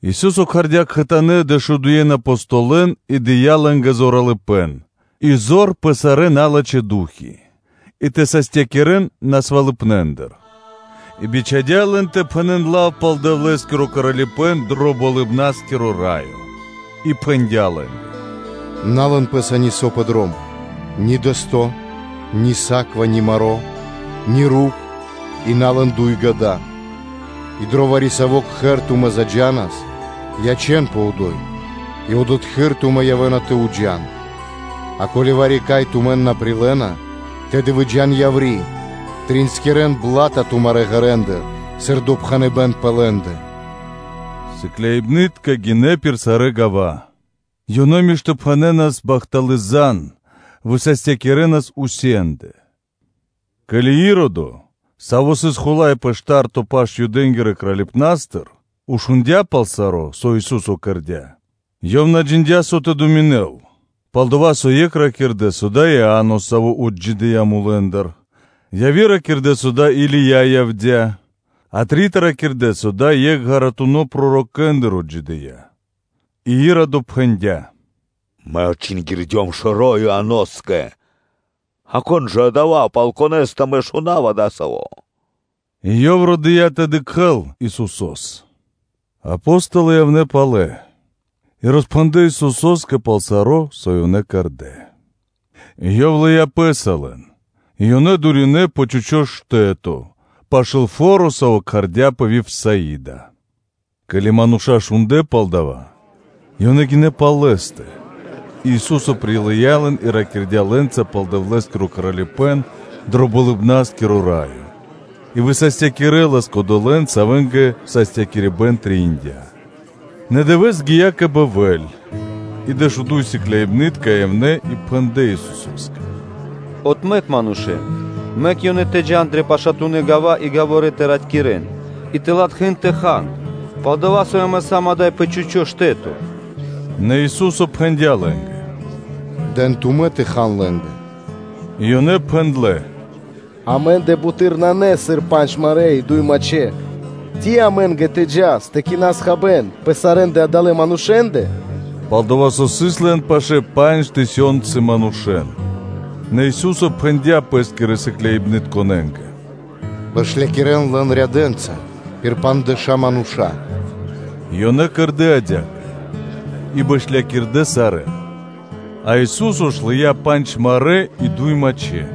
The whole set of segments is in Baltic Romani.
Ису́со кхардя́ кхэтанэ́ дэшудуен Апостолэн и дыя́ лэ́нгэ зоралыпэ́н и зор пэ сарэ́ налачхэ́ ду́хи и тэ састякирэн манушэ́н насвалыпнэндыр, и бичхадя́ лэн тэ пхэнэ́н лав пал Дэвлэ́скиро Кралипэ́н дро Болыбна́скиро Раё; и пхэндя́ лэ́нгэ: “На лэн пэ́са нисо́ пэ дром: ни дэсто́, ни саква, ни маро́, ни руп и на лэн дуй гада; и дро вари-саво́ кхэр тумэ́ заджанас, ячэ́нпэ одо́й и одотхы́р тумэ́ явэ́на тэ джа́н пэ́скэ; а ко́ли вари-кай тумэн на прилэ́на, то тэды выджа́н яври́, тринскирэн бла́та тумарэ́ ґэрэндыр, сыр допхэныбэ́н пэ лэ́ндэ.” Сыкляибны́тка гинэ́ пир сарэ́ гава́, ёнэ миштопхэнэнас бахталы́ зан (звесь), высастякирэнас усенде (везде). Ке́ли Иродо, саво́ сыс хула́й пэ шта́рто паш (тетрархо) Юдэ́нгирэ Кралипнастыр, шундя́ пал саро́, со Ису́со кэрдя́, ёв на джиндя́, со тэ думинэл: пал-дова́ со екх ракирдэ́, со дава́ сыс Иа́но, саво́ отджидыя́ мулэ́ндыр; а яви́р ракирдэ́, со дава́ Или́я явдя́; а трита ракирдэ́, со дава́ сыс екх ґаратунэ́ пророкэндыр отджидыя́. И Иродо пхэндя́: “Мэ отчингирдём шэро́ Ианоскэ; а кон исын жа Адава́, пал Конэ́стэ мэ шунава дасаво?” И ёв родыя тэ дыкхэ́л Исусо́с. Апо́столы явнэ́ палэ и роспхэндлэ́ Исусо́скэ пал саро́, со ёнэ кэрдэ́. Ёв лыя́ Пэ́са лэн и ёнэ дуринэ пэ чхучо́ штэ́то, пашы́л фо́ро, саво́ кхардяпэ Вифсаида. Ке́ли мануша́ шундлэ́ пал дава́, ёнэ гинэ́ пал Лэ́стэ, и Ису́со прилыя́ лэн и ракирдя́ лэ́нца пал Дэвлэ́скиро Кралипэ́н дро Болыбна́скиро Раё и высастякирэлас кодолэ́н, савэ́нгэ састякирибэн трэиндя́. Нэ дывэ́с гия́ кэ бэльвэ́ль, и дэшуду́й сыкляибны́тка явнэ́ и пхэндлэ́ Исусо́скэ: “Отмэк манушэ́н, мэк ёнэ тэ джа́н дрэ пашатунэ́ гава́ и гаворэ тэ ратькирэн и тэ латхэ́н тэ хан; пал-дова́ со амэ сам ада́й пэ чхучо́ штэ́то.” Нэ Ису́со пхэндя́ лэ́нгэ: “Дэн тумэ́ тэ хан лэ́нгэ.” И ёнэ пхэндлэ́: “Амэ́ндэ буты́р нанэ, сыр пандж марэ́ и дуй мачхэ́, ци амэ́нгэ тэ джас тэ кинас хабэ́н ваш сарэ́ адалэ́ манушэ́ндэ?” Пал-дова́ со сыс лэн пашэ́ пандж тысёнцы мануша́. Нэ Ису́со пхэндя́ Пэ́скирэ сыкляибнытконэ́нгэ: “Бэшлякирэн лэн рядэнца пир пандждэша́ мануша́.” И ёнэ кэрдэ́ адя́кэ, и бэшлякирдэ сарэ́н. А Ису́со ж лыя́ пандж марэ́ и дуй мачхэ́,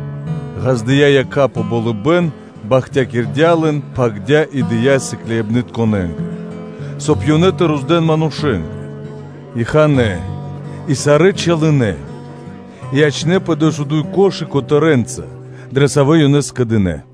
ґаздыя́ якха́ пэ болыбэ́н, бахтякирдя́ лэн, пхагирдя́ и дыя́ сыкляибнытконэ́нгэ, соб (кай) ёнэ тэ роздэн манушэ́нгэ. И ханэ́ и сарэ́ чалынэ; и ячнэ́пэ дэшуду́й корзи́ны (кхудэ́) котэрэнца, дрэ савэ́ ёнэ скэдынэ́.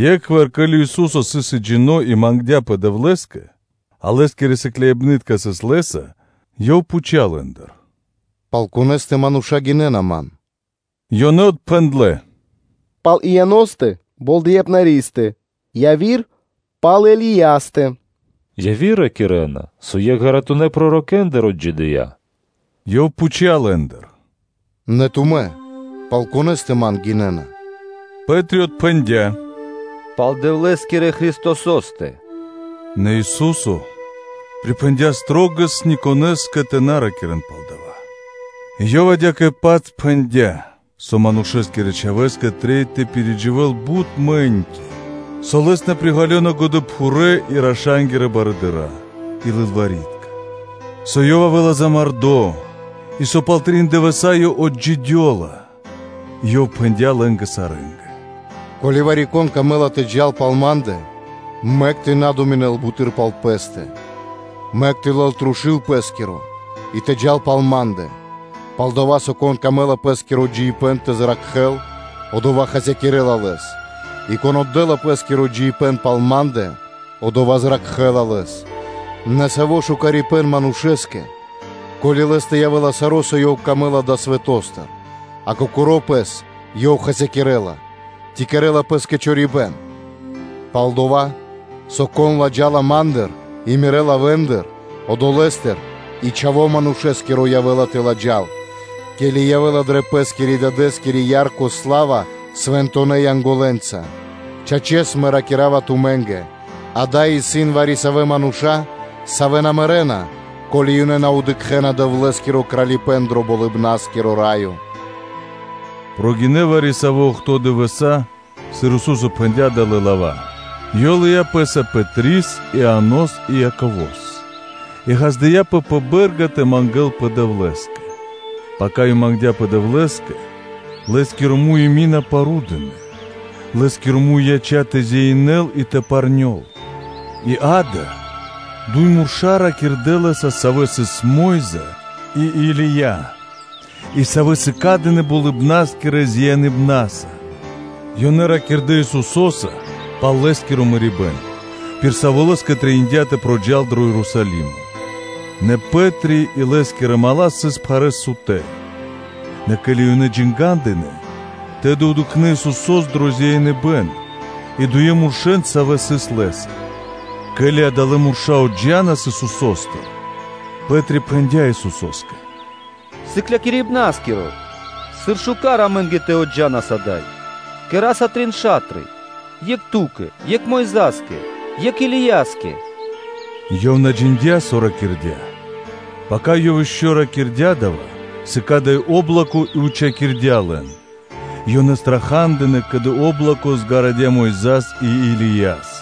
Екхвар, ке́ли Ису́со сыс екхджино́ и мангдя́пэ Дэвлэ́скэ, а Лэ́скирэ сыкляибны́тка сыс Лэ́са, Ёв пхуця́ лэ́ндыр: “Пал конэ́стэ мануша́ гинэ́на Ман?” Ёнэ отпхэндлэ́: “Пал Ианостэ Болдэипнаристэ, яви́р-пал Илиястэ; яви́р ракирэ́на, со екх ґаратунэ́ пророкэндыр отджидыя́.” Ёв пхуця́ лэ́ндыр: “Нэ тумэ́ пал конэ́стэ Ман гинэ́на?” Пэ́три отпхэндя́: “Пал Дэвлэ́скирэ Христосо́стэ.” Нэ Ису́со припхэндя́ шылалэс ни конэ́скэ тэ на ракирэ́н пал дава́. И Ёв адя́кэ-паць пхэндя́, со Манушэ́скирэ Чхавэ́скэ трэй тэ пиридживэл бут мэ́ньки, со Лэс на приґалёна годэпхурэ́ и раша́нгирэ барыдыра́ и лылвари́тка, со Ёв явэ́ла замардо, и со пал трин дывэса́ Ёв отджидёла. И Ёв пхэндя́ лэ́нгэ сарэ́нгэ: “Ко́ли вари-кон камэ́ла тэ джал пал Ма́ндэ, мэк тэ на думинэл буты́р пал пэ́стэ, мэк тэ лэл трушу́л пэ́скиро и тэ джал пал Ма́ндэ; пал-дова́ со, кон камэ́ла пэ́скиро джиибэ́н тэ зракхэ́л, одова́ хасякирэ́ла лэс, и кон отдэ́ла пэ́скиро джиибэ́н пал Ма́ндэ, одова́ зракхэ́ла лэс, нэ саво́ лачхипэ́н манушэ́скэ, ко́ли лэ́стэ явэ́ла саро́, со Ёв камэ́ла далэ́ свэто́стыр, а кокоро́ пэс ёв хасякирэ́ла, ци кэрэ́ла пэ́скэ чорипэ́н? Пал-дова́ со кон ладжала Ма́ндыр и Мирэ́ лавэ́ндыр, одолэ́стыр и Чхаво́ Манушэ́скиро явэ́ла тэ ладжал, ке́ли явэ́ла дрэ Пэ́скирэ-Дадэ́скири ярко сла́ва свэнтонэ́ Янголэнца, Чачэс, Мэ ракира́ва тумэ́нгэ: ада́й исын вари-савэ́ мануша́, савэ́ на мэрэ́на, ко́ли ёнэ на дыкхэ́на Дэвлэ́скиро Кралипэ́н дро Болыбна́скиро Раё.” Прогинэ́ вари-савэ́ охто́ (бидуе́нгиро дэш) дывэса́, сыр Ису́со пхэндя́ далэ́ лава́, и Ёв лыя́ Пэ́са Пэтрис, Ианос и Яково́с и ґаздыя́пэ пэ бэ́рга тэ мангэ́лпэ Дэвлэ́скэ. Пака Ёв мангдя́пэ Дэвлэ́скэ, Лэ́скиро муй и мина парудынэ, Лэ́скиро муй яця́ тэ зяинэл и парнёл. И, ґа́да, дуй мурша́ ракирдэ́ Лэ́са, савэ́ сыс Мо́йза (Моисеё) и Или́я; и савэ́ сыкадынэ болыбна́скирэ зяиныбнаса; ёнэ ракирдэ́ Исусо́са пал Лэ́скиро мэрибэ́н, пир саво́ Лэ́скэ трэиндя́ тэ проджал дро Ерусалимо. Нэ Пэ́три и лэ́скирэ мала́ сыс пхарэ́с сутэ́; нэ ке́ли ёнэ джангадынэ, тэды дыкхнэ́ ёнэ Исусо́с дро зяиныбэн и дуе муршэ́н, савэ́ сыс Лэ́са. Ке́ли адалэ́ мурша́ отджанас Исусо́стыр, Пэ́три пхэндя́ Исусо́скэ: “Сыклякирибна́скиро! Сыр шука́р амэ́нгэ тэ явас ада́й; кэра́са трин ша́тры; екх Ту́кэ, екх Мойза́скэ, екх Илияскэ – ёв на джиндя́, со ракирдя́. Пака ёв ишчо (инкэ́) ракирдя́ дава́, сыкадыя́ о́блоко и учхакирдя́ лэн; и ёнэ страха́дынэ, ке́ли о́блоко гарадя Мойза́с и Илияс.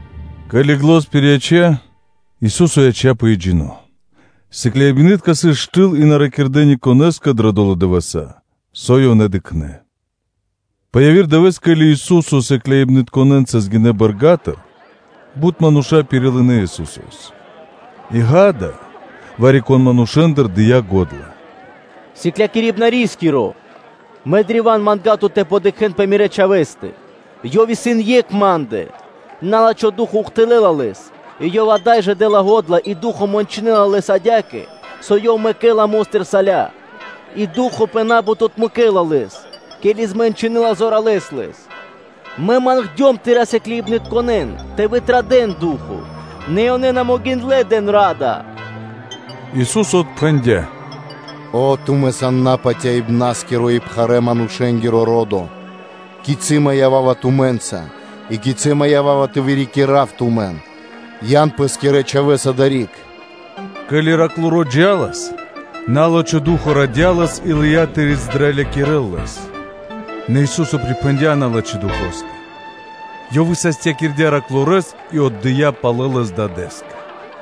Ке́ли зан пирияця́, Ису́со яця́пэ екхджино́. Сыкляибны́тка сыс штыл и на ракирдэ́ ни конэ́скэ дрэ долэ́ дывэса́, со ёнэ дыкхнэ́. Пэ яви́р дывэ́с, ке́ли Ису́со сыкляибнытконэ́нца гинэ́ тэлэ́ бэрга́тыр, бут мануша́ пирилынэ Исусо́с. И, гада, вари-кон манушэ́ндыр, дыя́ го́дла: “Сыклякирибнарискиро! Мэ древа́н манга́ва Тут тэ дыкхэ́н мирэ́ чхавэ́стэ, ёв исын екх ма́ндэ; на́лачхо ду́хо (фа́но) ухтылэ́ла лэс, и ёв ада́й жэ дэ́ла го́дла и ду́хо (фа́но) мэнчынэла лэс кэ пена мо́стыр; и ду́хо (фа́но) пэ на́бут отмэкэ́ла лэс, ке́ли змэнчынэла зоралэ́с лэс; мэ мангдём Тырэ́ сыкляибнытконэ́н тэ вытрадэл ду́хо (фа́но), нэ ёнэ на могиндлэ́ тэ дын ра́да.” Ису́со отпхэндя́: “О, тумэ́ сан напатяибнаскиро и пхарэ́-манушэ́нгиро ро́до! Кицы́ Мэ ява́ва тумэ́нца и кицы́ Мэ ява́ва тэ вырикирав тумэн? Ян пэ́скирэ чхавэ́с адари́к!” Ке́ли тэрнэ́-бэршэнтиро джа́лас, на́лачхо ду́хо (фа́но) радя лэс и лыя́ тэ издралякирэл лэс; нэ Ису́со припхэндя́ на́лачхо духоскэ; Ёв высастякирдя́ тэрнэ́-бэршэнгирэс и отдыя́ палэ лэс дадэ́скэ.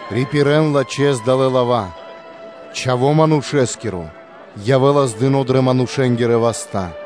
“Рипирэн лачхэ́с далэ́ лава́: ‘Чхаво́ Манушэ́скиро явэ́ла отдыно́ дрэ манушэ́нгирэ васта́.’”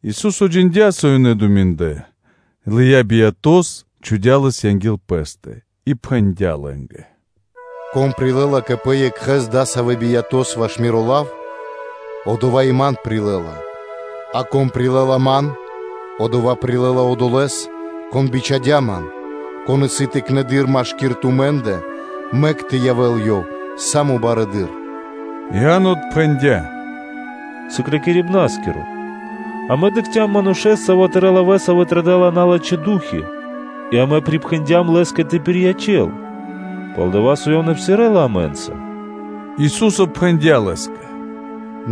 Ису́со джиндя́, со ёнэ думиндлэ, лыя́ биято́с, чхудя́ лэс анги́л Пэ́стэ, и пхэндя́ лэ́нгэ: “Кон прилэ́ла кэ пэ екхэ́с адасавэ́ биято́с ваш Миро лав, одова́ и Ман прилэ́ла, а кон прилэ́ла Ман, одова́ прилэ́ла Одолэ́с, Кон бичхадя́ Ман, кон исын тыкнэды́р машки́р тумэ́ндэ, мэк тэ явэ́л ёв са́мо барэды́р.” Иа́но тэды пхэндя́: “Сыклякирибна́скиро! Амэ дыкхцям манушэ́с, саво́ Тырэ́ лавэ́са вытрадэла налачхэ́ ду́хи (фаны) и амэ припхэндям Лэ́скэ тэ пириячэл, пал-дова́ со ёв на псирэ́ла амэ́нца.” Ису́со пхэндя́ лэ́скэ: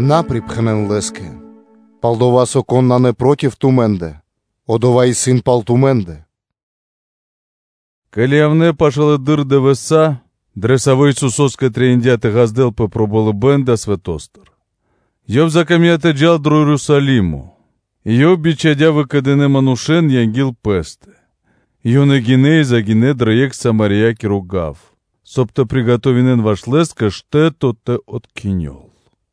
“На припхэнэн лэ́скэ; пал-дова́ со кон исын на проти тумэ́ндэ, одова́ исын пал тумэ́ндэ.” Ке́ли явнэ́ пашылэды́р дывэса́, дрэ савэ́ Исусо́скэ трэиндя́ тэ ґаздэлпэ пэ болыбэ́н далэ́ свэто́стыр, ёв закамдя́ тэ джал дро Ерусалимо, и Ёв бичхадя́ выкэдынэ́ манушэ́н анги́л Пэ́стэ; и ёнэ гинэ́ и загинэ́ дро екх Самариякиро гав, соб (кай) тэ кэдэн ваш Лэ́скэ штэ́то тэ откхинёл,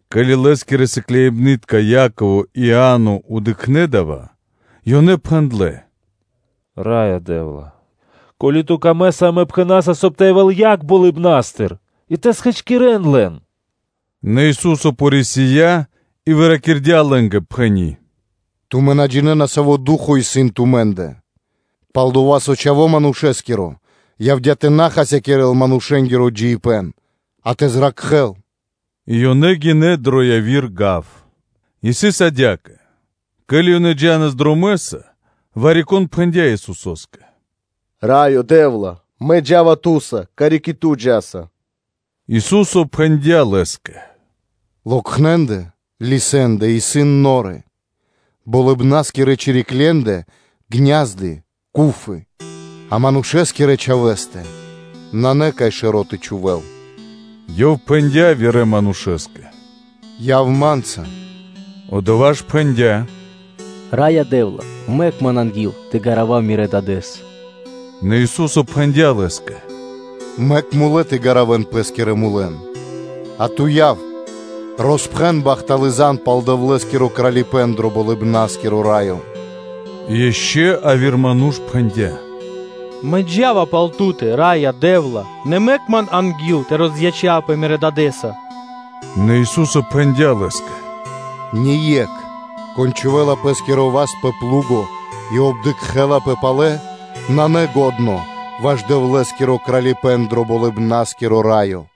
Ке́ли Лэ́скирэ сыкляибны́тка Яково и Иа́но дыкхнэ́ дава́, ёнэ пхэндлэ́: “Раё Дэ́вла! Ко́ли Ту камэ́са, амэ пхэна́са, соб (кай) тэ явэ́л яг болыбна́стыр и тэ хачкирэл лэн?” Нэ Ису́со порисия и выракирдя лэ́нгэ, пхэни́: “Тумэ́ на джинэ́на, саво́ ду́хо (фа́но) исын тумэ́ндэ. Пал-дова́ со Чхаво́ Манушэ́скиро явдя́ тэ на хасякирэ́л манушэ́нгиро джиибэ́н, а тэ зракхэ́л.” И ёнэ гинэ́ дро яви́р гав. И сыс адя́кэ: ке́ли ёнэ джа́нас дромэ́са, вари-кон пхэндя́ Исусо́скэ: “Раё Дэ́вла! Мэ джа́ва Ту́са, карик и Ту джа́са.” Ису́со пхэндя́ Лэ́скэ: “Локхне́ндэ (лисэнды) исын норы, болыбна́скирэ чириклендэ гня́зды (ку́фы), а Манушэ́скирэ Чхавэ́скэ нанэ, кай шэро́ тэ чхувэ́л.” Ёв пхэндя́ явирэ манушэ́скэ: “Яв Ма́нца!” Одова́ ж пхэндя́: “Раё Дэ́вла! Мэк ман анги́л тэ гаравав Мирэ́ дадэ́с.” Нэ Ису́со пхэндя́ Лэ́скэ: “Мэк мулэ́ тэ гаравэн пэ́скирэ мулэн; а ту, яв, роспхэн бахталы́ зан (звесь) пал Дэвлэ́скиро Кралипэ́н дро Болыбна́скиро Раё.” И ишчо (инкэ́) яви́р ману́ш пхэндя́: “Мэ джа́ва пал Ту́тэ, Раё Дэ́вла! Нэ мэк ман анги́л тэ розячавпэ мирэ́ сэмэнцаса.” Нэ Ису́со пхэндя́ Лэ́скэ: “Ние́кх, кон чхувэ́ла пэ́скиро васт пэ плуго (пхарады) и обдыкхэлапэ палэ, исын на лачхо́ ваш Дэвлэ́скиро Кралипэ́н дро Болыбна́скиро Раё.”